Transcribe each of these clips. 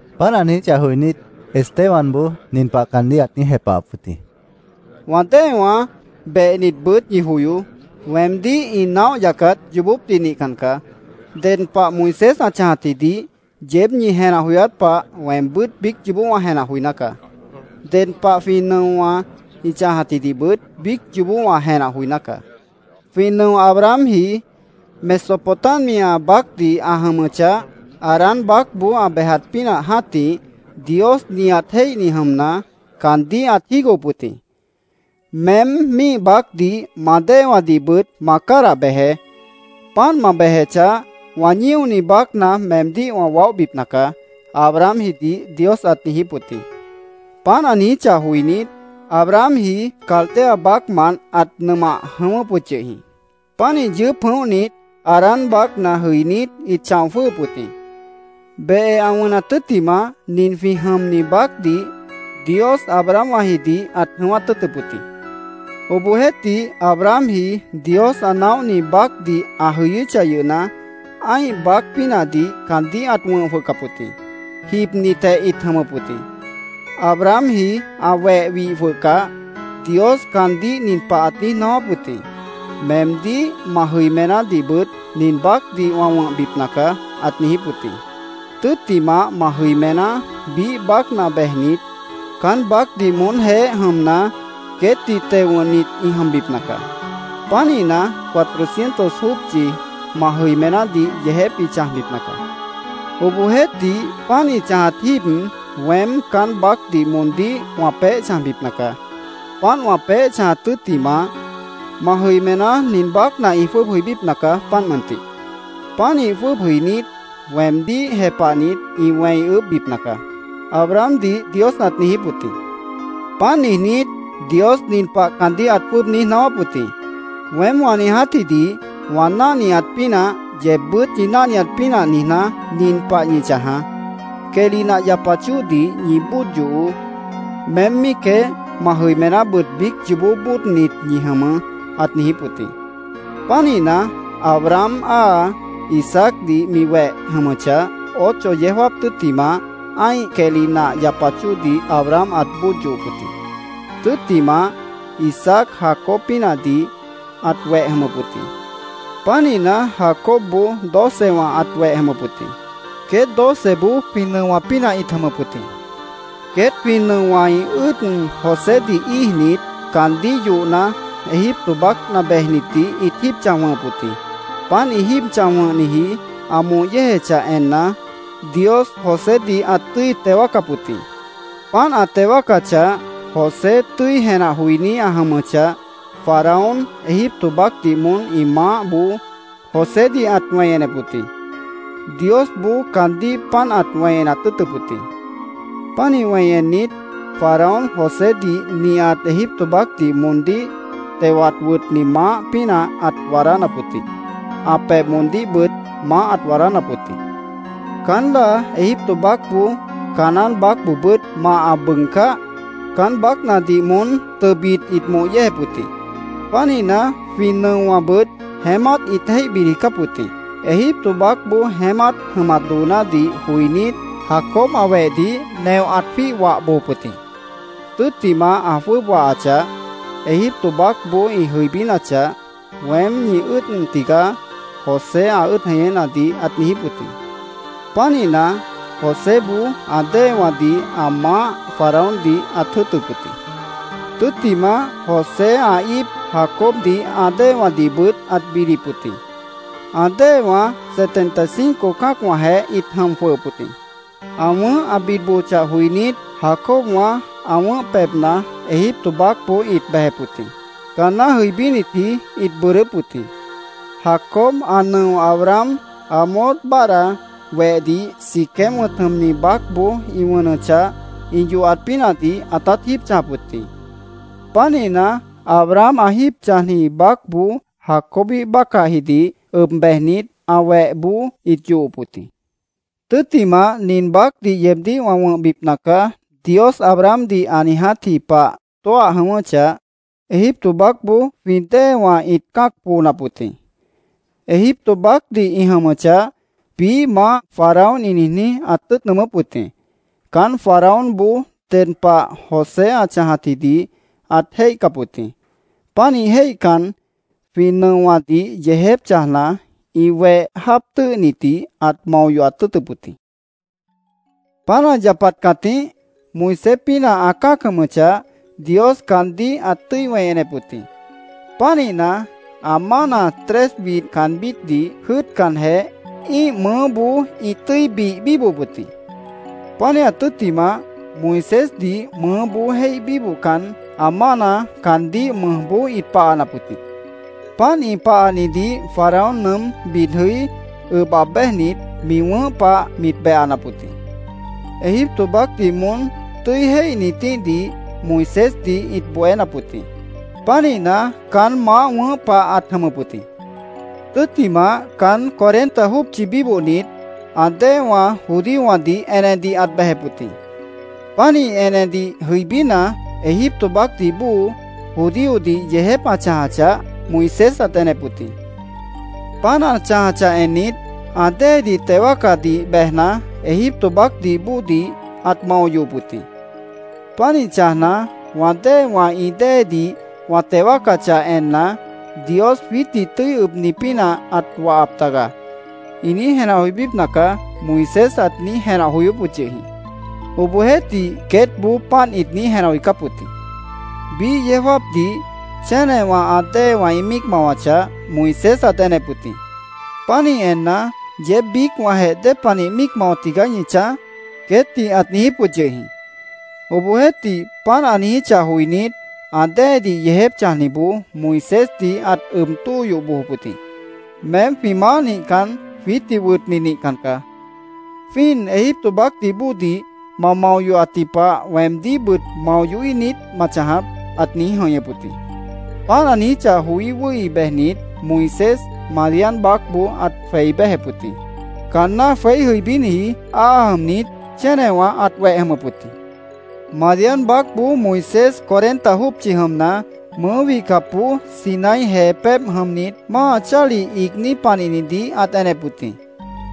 Páant ã niijíchah joinít, Estebanboó nin pah caandíh ãt niíj jepahap wʉt jĩ: “Wã déewãá, behnitbʉt ñi joyoó. Weemdíh ĩ naóh yacat yoobópdih nihcan caá. Ded pah Moisés ã chãjatjidih yeéb ñi jenah joyát pah weembʉ́t biíc yoobó wã jenah joiná caá. Ded pah jwĩ nʉowã ĩ chãjatjidihbʉt biíc yoobó wã jenah joiná caá. Jwĩ nʉo Abrahamji Mesopotamia baácdih ã jʉmʉchah, Harán baácboó ã bejat pínah jã́tih, Dios nihat jéihni jʉmna, caandíh ãt jígohop wʉt jĩ. ‘Meém míih baácdih ma déewãdihbʉt ma cádah bejeé. Páant ma bejechah, wã ñíoni baácna meemdíh wã waóhbipna caá’, Abrahamjidih Dios ãt niijíp wʉt jĩ. Páant ã niijíchah joinít, Abrahamji Caldea baácmant ãt nʉmah jʉ̃ʉ́wʉ́p wʉt yʉh jĩ. Pánih yʉʉ́p jʉ̃óhnit, Harán baácna jʉinít, ĩt chão jwʉ́ʉhʉp wʉt jĩ. Behe ã wʉnat tʉ́ttimah, nin jwĩ jʉmni baácdih Dios Abrahamwãjidih ãt jʉ̃ʉ́wát tʉ́ʉtʉp wʉt jĩ. Obohjeéhtih, Abrahamji Dios ã naóhni baácdih ã jʉyʉ́chah yʉhna, ã́ih baác pínahdih caandíh ãt wʉ̃h jwʉhcap wʉt jĩ. Jibnitjeh ĩt jʉmʉp wʉt jĩ. Abrahamji ã weh wih jwʉhcah, Dios caandíh nin pah ãt niíj naáwáp wʉt jĩ: ‘Meemdíh, ma jʉimenádihbʉt nin baácdih wã wʉ̃hbipna caá’, ãt niijíp wʉt jĩ. ‘Tʉ́ttimah, ma jʉimená biíh baácna bejnit, caán baácdih moónjeéh jʉmna, queétdih teo wʉ̃hnit ĩ jʉmbipna caá. Pánihna, cuatrocientos jópchi ma jʉimenádih yeejép ĩ chãjbipna caá. Obohjeéhtih, páant ĩ chãjat jíib, weém caán baácdih moondíh wã peéh chãjbipna caá. Páant wã peéh chãjat tʉ́ttimah, ma jʉimená nin baácna ĩ jwʉ́ʉb jʉibípna caá, páant mʉntih. Pánih jwʉ́ʉb jʉinít, weemdíh jepahnit, ĩ wẽi ʉʉ́bhbipna caá’, Abrahamdih Dios ãt niijíp wʉt jĩ. Páant niijnít, Dios nin pah caandíh ãt jwʉ́ʉb niíj naáwáp wʉt jĩ: ‘Weém wã niijátjidih wã náhniat pínah, yeebbʉ́t ñi náhniat pínah niijná, nin pah ñi chãjaá: Quehli nah yapat chóodih ñi bóod yohoó. Meém míicjeh, ma jʉimenábʉt biíc yoobó bóodnit ñi jʉmʉʉ́’, ãt niijíp wʉt jĩ. Pánihna, Abraham áa Isaacdih mi weép jʉmʉchah, ocho yeó jáap tʉ́ttimah, ã́ih quehli nah yapat chóodih Abraham ãt bóod yohop wʉt jĩ. Tʉ́ttimah, Isaac Jacob pínahdih ãt weh jʉmʉp wʉt jĩ. Pánihna, Jacobboó docewã ãt weh jʉmʉp wʉt jĩ. Queét doceboó jwĩ nʉowã pínah ĩt jʉmʉp wʉt jĩ. “Queét jwĩ nʉowã ĩ ʉ́ʉd Josédih íijnit, caandíh yohna, Egipto baácna bejnitdih ĩt jíib chãj wʉ̃hʉp wʉt jĩ. Páant ĩ jíib chãj wʉ̃hniji ã moh yéejechah enna, Dios Josédih ãt tʉ́i teo wáacap wʉt jĩ. Páant ã teo wáacachah, José tʉ́i jenah joiní ã jʉmʉchah, Faraón Egipto baácdih moón ĩ maáhboó Josédih ãt wẽi enep wʉt jĩ. Diosboó caandíh páant ãt wẽi enat tʉ́ʉtʉp wʉt jĩ. Pánih wẽi ennit, Faraón Josédih nihat Egipto baácdih moondíh tewat wʉtni maáh pínah ãt waadánap wʉt jĩ. Ã pebh moondíhbʉt maáh ãt waadánap wʉt jĩ. “Caán láa Egipto baácboó Canaán baácboobʉ́t mah ã bʉʉgcáh, caán baácnadih moón tʉbit ĩt moh yéejep wʉt jĩ. Pánihna, jwĩ nʉowãbʉt jeémát ĩt jéih bid jʉicáp wʉt jĩ. Egipto baácboó jeémát jʉmat doonádih joinít, Jacob ã wehdih neoh ãt jwíih wah bojop wʉt jĩ. Tʉ́ttimah ã jwʉ́ʉb wahachah, Egipto baácboó ĩ jʉibínachah, ‘Weém ñi ʉ́ʉd tigaá’, José ã ʉ́ʉd jeñénadih ãt niijíp wʉt jĩ. Pánihna, Joséboó ã déewãdih ã maáh Faraóndih ãt jʉ́ʉtʉp wʉt jĩ. Tʉ́ttimah, José ã íip Jacobdih ã déewãdihbʉt ãt bidip wʉt jĩ. Ã déewã setenta y cinco cã́acwãjeh ĩt jʉm jwʉhʉp wʉt jĩ. Ã wʉ̃ʉ́h ã bid bojochah joinít, Jacobwã ã wʉ̃ʉ́h pebhna Egipto baácboó ĩt bejep wʉt jĩ. Caanná jʉibínitji ĩt bʉʉdʉ́p wʉt jĩ. Jacob ã nʉo Abraham Hamor báadhda wehdih Siquem wʉ̃t jʉmni baácboó ĩ wʉnʉchah ĩ yohat pínahdih ãtát jíib chãjap wʉt jĩ. Pánihna, Abraham ã jíib chãjniji baácboó Jacobíh bácahjidih ʉb bejnit, ã wehboó ĩt yohop wʉt jĩ. “Tʉ́ttimah, ‘Nin baácdih yeebdíh wã wʉ̃hbipna caá’, Dios Abrahamdih ã niijátji pah tóah jʉ̃ʉ́wʉ́chah, Egipto baácboó jwĩ déewã ĩt cã́ac poonap wʉt jĩ. Egipto baácdih ĩ jʉmʉchah, biíh maáh Faraón ĩ niijní, ãt tʉ́ʉt nʉʉmʉ́p wʉt jĩ. Caán Faraónboó ded pah José ã chãjatjidih ãt jéihcap wʉt jĩ. Pánih jéihcan, jwĩ nʉowãdih yeejép chãjna, ĩ weh jáap tʉ́ʉhnitdih ãt mao yohat tʉ́ʉtʉp wʉt jĩ. Páant ã yapat cãtíh, Moisés pínah ã cã́ac jʉmʉchah, Dios caandíh ãt tʉ́i wẽi enep wʉt jĩ. Pánihna, ã mána tres widh caanbítdih jʉ́ʉtcanjeh, ĩ́ih mʉʉ́boó ĩt tʉ́i bih bíbohop wʉt jĩ. Pánihat tʉ́ttimah, Moisésdih mʉʉ́boó jéih bíbohcan, ã mána caandíh mʉjboó ĩt pahanap wʉt jĩ. Páant ĩ pahanidih Faraón nʉʉ́m bid jʉí, ʉb aab béjnit, mi wʉ̃ʉ́h pah mit behanap wʉt jĩ. Egipto baácdih moón tʉ́i jéihnitíhdih Moisésdih ĩt bohénap wʉt jĩ. Pánihna, caán maáh wʉ̃ʉ́h pah ãt jʉmʉp wʉt jĩ. “Tʉ́ttimah, caán cuarenta jópchi bíbohnit, ã déewã judíowãdih enedih ãt bejep wʉt jĩ. Pánih enedih jʉibína, Egipto baácdih bóo judíodih yeejép ã chãjachah, Moisés ãt enep wʉt jĩ. Páant ã chãjachah ennit, ã déedih teo wáacadih bejna, Egipto baácdih bóodih ãt mao yohop wʉt jĩ. Pánih chãjna, ‘Wã déewã ĩ déedih wã teo wáacachah enna, “Dios jwiítdih tʉ́i ʉbni pínah ãt wahap taga”, ĩ niíj jenah joibípna caá’, Moisés ãt niíj jenah joyóp wʉt yʉh jĩ. Obohjeéhtih, queétboó páant ĩt niíj jenah joicáp wʉt jĩ. Biíh yeó jáapdih chénewã ã déewã ĩ míic mawachah, Moisés ãt enep wʉt jĩ. Pánih enna, ‘¿Yeéb biícwãjeh dépanih míic mao tigaá ñi chãj?’ queétdih ãt niijíp wʉt yʉh jĩ. Obohjeéhtih, páant ã niijíchah joinít, ã déedih yeejép chãjniboó Moisésdih ãt ʉb tóo yoh bojop wʉt jĩ. ‘Meém jwĩ maáh nihcan, jwiítdih wʉtni nihcan caá. ¿Jwíin Egipto baácdih bóodih ma mao yohatji pah weemdíhbʉt mao yohíh niít ma chãjap?’ ãt niíj jʉ̃ihñʉp wʉt jĩ. Páant ã niijíchah joí wʉ́hi bejnit, Moisés Madián baácboó ãt jweí béjep wʉt jĩ. Caanná jweí jʉibíniji áa jʉmnit, chénewã ãt weh jʉmʉp wʉt jĩ. “Madián baácboó Moisés cuarenta jópchi jʉmna, mʉʉ́ wihcapboó Sinaí jee pébh jʉmnit, máa chálih iigní panihnidih ãt enep wʉt jĩ.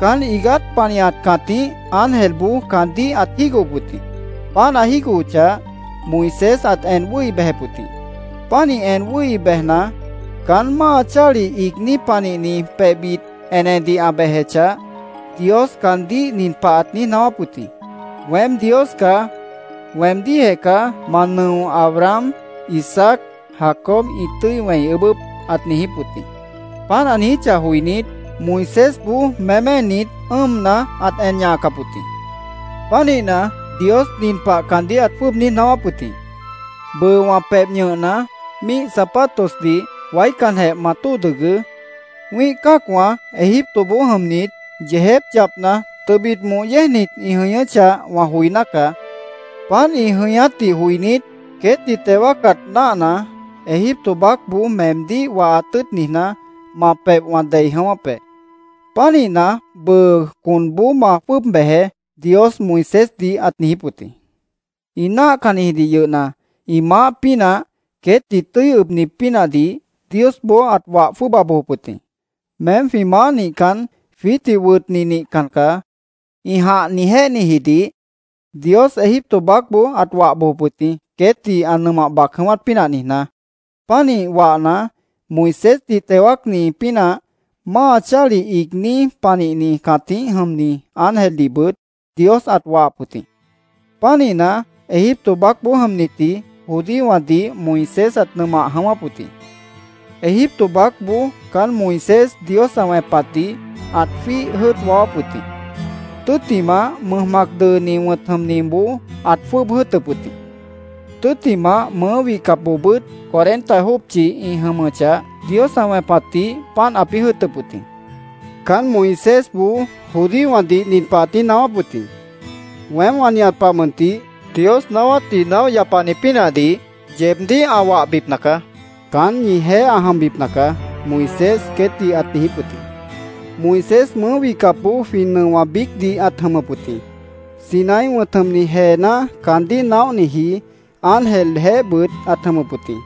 Caán iigát panihat cãtíh ángelboó caandíh ãt jígohop wʉt jĩ. Páant ã jígohochah, Moisés ãt en wʉ́hi bejep wʉt jĩ. Pánih en wʉ́hi bejna, caán máa chálih iigní panihni pebhbit enedih ã bejechah, Dios caandíh nin pah ãt niíj naáwáp wʉt jĩ: ‘Weém Dios caá. Weemdíhjeh caá ma nʉowã, Abraham, Isaac, Jacob ĩ tʉ́i wẽi ʉʉ́bʉ́p’, ãt niijíp wʉt jĩ. Páant ã niijíchah joinít, Moisésboó méménit, ʉ́ʉmna, ãt en ñahacap wʉt jĩ. Pánihna, Dios nin pah caandíh ãt jwʉ́ʉb niíj naáwáp wʉt jĩ: ‘Bʉʉ wã pebh ñʉhna, míih zapatosdih waícanjeh ma tóo dʉgʉʉ́. Wĩ́ih cã́acwã Egiptoboó jʉmnit, yeejép yapna, tʉbit moh yéejnit ĩ jʉñʉ́chah, wã joiná caá. Páant ĩ jʉñátdih joinít, queétdih teo wáacat náahna, Egipto baácboó meemdíh wahat tʉ́ʉt niijná, ma pebh wã dei jʉ̃ʉ́wʉ́p be. Pánihna, bʉʉ conboó ma jwʉ́ʉb bejeé’, Dios Moisésdih ãt niijíp wʉt jĩ. “Ĩ náahcannijidih yʉhna, ĩ maáh pínah, queétdih tʉ́i ʉbni pínahdih Diosboó ãt wah jwʉ́ʉba bojop wʉt jĩ. ‘Meém jwĩ maáh nihcan, jwiítdih wʉtni nihcan caá’, ĩ jãh niijjéhnijidih Dios Egipto baácboó ãt wah bojop wʉt jĩ, queétdih ã nʉmah bac jʉ̃ʉ́wát pínah niijná. Pánih wahna, Moisésdih teo wáacni pínah máa chálih iigní panihni cãtíh jʉmni ángeldihbʉt Dios ãt wahap wʉt jĩ. Pánihna, Egipto baácboó jʉmnitji judíowãdih Moisés ãt nʉmah jʉ̃ʉ́wʉ́p wʉt jĩ. Egipto baácboó caán Moisés Dios ã wẽpatdih ãt jwíih jʉ́ʉt waáwáp wʉt jĩ. Tʉ́ttimah, Mʉj Mac Dʉʉni wʉ̃t jʉmniboó ãt jwʉ́ʉb jʉ́ʉtʉp wʉt jĩ. Tʉ́ttimah, mʉʉ́ wihcapboobʉ́t cuarenta jópchi ĩ jʉmʉchah, Dios ã wẽpatdih páant ãpĩ́ jʉ́ʉtʉp wʉt jĩ. Caán Moisésboó judíowãdih nin pah ãt niíj naáwáp wʉt jĩ: ‘Weém wã nihat pah mʉntih Dios naáwátdih naóh yapani pínahdih yeebdíh ã wahbipna caá. Caán ñijeéh ã jʉmbipna caá’, Moisés queétdih ãt niijíp wʉt jĩ. Moisés mʉʉ́ wihcapboó jwĩ nʉowã biícdih ãt jʉmʉp wʉt jĩ. Sinaí wʉ̃t jʉmni jeená caandíh naóhniji ángeljeéhbʉt ãt jʉmʉp wʉt jĩ.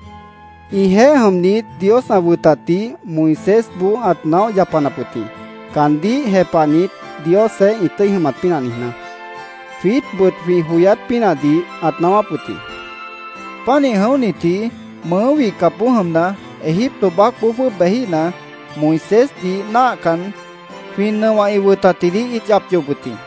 Ĩjeéh jʉmnit, Dios ã wʉtatdih Moisésboó ãt naóh yapanap wʉt jĩ, caandíh jepahnit, Diosjeéh ĩ tʉ́i jʉmat pínah niijná. Jwiítbʉt jwĩ joyát pínahdih ãt naáwáp wʉt jĩ. “Pánih jʉ̃óhnitji mʉʉ́ wihcapboó jʉmna, Egipto baácboó jwʉ́ʉb bejíhna, Moisésdih náahcan, jwĩ nʉowã ã wʉtatdih ĩt yap yohop wʉt jĩ.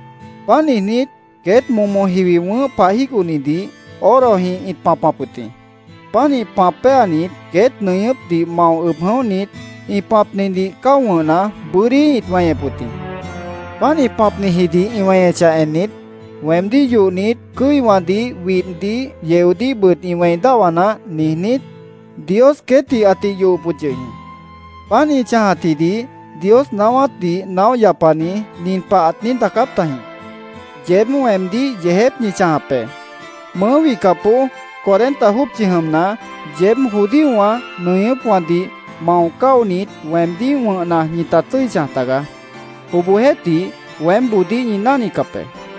Páant niijnít, queét momo jiwi wʉ̃ʉ́h pah jígohnidih orojĩh ĩt pãpap wʉt jĩ. Pánih pãp péanit, queét nʉñʉ́pdih mao ʉb jʉ̃óhnit, ĩ pãpnidih cáo wʉ̃hna, bʉ́dí ĩt weñep wʉt jĩ. Páant ĩ pãpnijidih ĩ weñechah ennit, ‘Weemdíh yohnit, cʉ́iwãdih, widhdih, yeodíhbʉt ĩ wẽi dáhwa naáh’, niijnít, Dios queétdih ãtih yohop wʉt yʉh jĩ. Páant ĩ chãjatjidih Dios naáwátdih naóh yapani nin pah ãt niíj daacáp tajĩ: ‘ “Yeéb weemdíh yeejép ñi chãjap be. Mʉʉ́ wihcapboó cuarenta jópchi jʉmna, yeéb judíowã nʉñʉ́pwãdih mao cáonit, weemdíh wʉ̃hna, ñita tʉ́i chãj tagaá. Obohjeéhtih, weémboodíh ñi náhnicap be.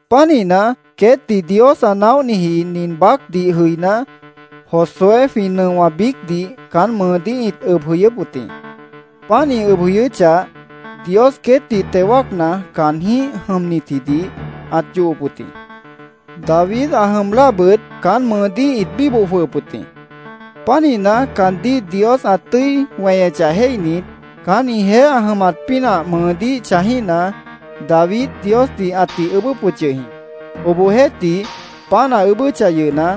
Pánihna, queétdih Dios ã naóhniji nin baácdih jʉiná, Josué jwĩ nʉowã biícdih caán mʉʉdíh ĩt ʉb jʉyʉ́p wʉt jĩ. Páant ĩ ʉb jʉyʉ́chah, Dios queétdih teo wáacna, caanjĩ́h jʉmnitjidih ãt yohop wʉt jĩ. David ã jʉm láabʉt caán mʉʉdíh ĩt bíboh jwʉhʉp wʉt jĩ. Pánihna, caandíh Dios ã tʉ́i weñechah jéihnit, caán ĩjeéh ã jʉmat pínah mʉʉdíh chãjíhna, David Diosdih ãtih ʉʉ́bʉ́p wʉt yʉh jĩ. Obohjeéhtih, páant ã ʉʉ́bʉ́chah yʉhna,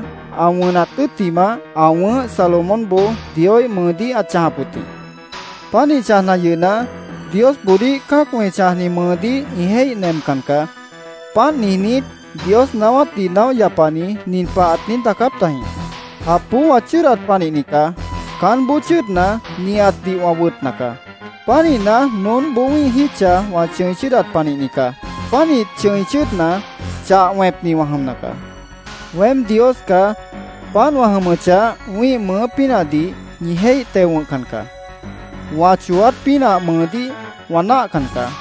ã wʉnat tʉ́ttimah, ã wʉ̃ʉ́h Salomónboó Dioíh mʉʉdíh ãt chãjap wʉt jĩ. Pánih chãjna yʉhna, Diosboodíh cã́acwã ĩ chãjni mʉʉdíh ĩ jéih nemcan caá. Páant niijnít, Dios naáwátdih naóh yapani nin pah ãt niíj daacáp tajĩ: ‘ “Japboó wã chʉ́ʉdat panihni caá. Caánboó chʉ́ʉdna, nihatdih wã wʉtna caá. Pánihna, noónboó wĩ́ih jítcha wã chʉ̃i chʉ́ʉdat panihni caá. Pánih chʉ̃i chʉ́ʉdna, chah wẽpni wã jʉmna caá. Weém Dios caá. Páant wã jʉmʉchah, wĩ́ih mʉʉ́ pínahdih ñi jéih teo wʉ̃hcan caá. Wã chooát pínah mʉʉdíh wã náahcan caá.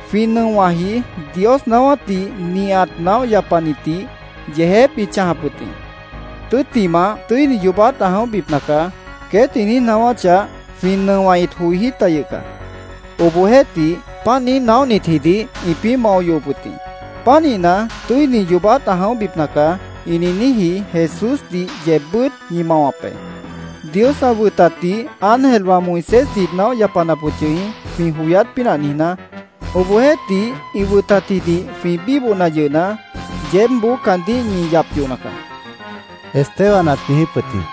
Jwĩ nʉowãji Dios naáwátdih nihat naóh yapanitdih yeejép ĩt chãjap wʉt jĩ. ‘Tʉ́ttimah tʉ́ini yoobát ã jʉ̃óhbipna caá’, queét ĩ niíj naáwáchah, jwĩ nʉowã ĩt joijí ta yʉh caá. Obohjeéhtih, páant niíj naóhnitjidih ĩpĩ́ mao yohop wʉt jĩ. Pánihna, ‘Tʉ́ini yoobát ã jʉ̃óhbipna caá’, ĩ niijníji Jesúsdih yeebbʉ́t ñi mawap be. Dios ã wʉtatdih ángelwã Moisésdih ĩt naóh yapanap wʉt yʉh jĩ, jwĩ joyát pínah niijná. Obohjeéhtih, ĩ wʉtatjidih jwĩ bíbohna yʉhna, yeébboó caandíh ñi yap yohna caá”, Esteban ãt niijíp wʉt jĩ.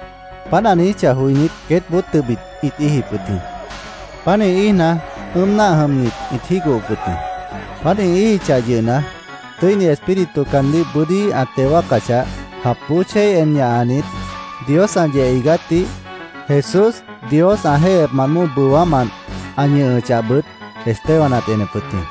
Páant ã niijíchah joinít, queétboó tʉbit ĩt íijip wʉt jĩ. Pánih íijna, ʉ́ʉm náah jʉmnit ĩt jígohop wʉt jĩ. Páant ĩ íijichah yʉhna, Tʉ́ini Espíritu caandíh bʉ́dí ã teo wáacachah, japboó chéi en ñahanit, Dios ã yeh iigátdih, Jesús Dios ã jéihyepmant bóo bʉwámant ã ñʉhʉchahbʉt Esteban ãt enep wʉt jĩ.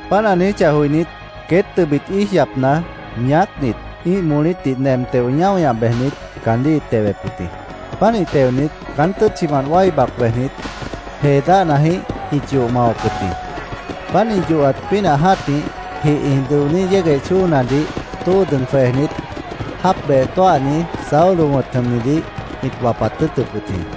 Páant ã niijíchah joinít, queét tʉbit íij yapna, ñaácnit, ĩ́ih molítdih nem teo, ñáo ñah bejnit, caandíh ĩt tewep wʉt jĩ. Pánih teonit, caán tʉ́tchimant wái bac bejnit, jee dáhnajĩh ĩt yoh mawap wʉt jĩ. Páant ĩ yohat pínah jã́tih, jih ĩ dʉoní yégueh chóonadih tóo dʉg jwejnit, jáap beh tóahni Saulo wʉ̃t jʉmnidih ĩt wapat tʉ́ʉtʉp wʉt jĩ.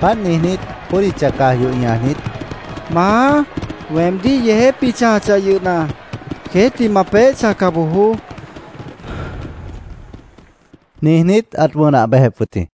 Páant niijnít, bódicha caj yoh ñajnit, “Maá, weemdíh yeejép ĩ chãjachah yʉhna, queétdih ma peéh chãjca bojoó”, niijnít, ãt wʉnah bejep wʉt jĩ.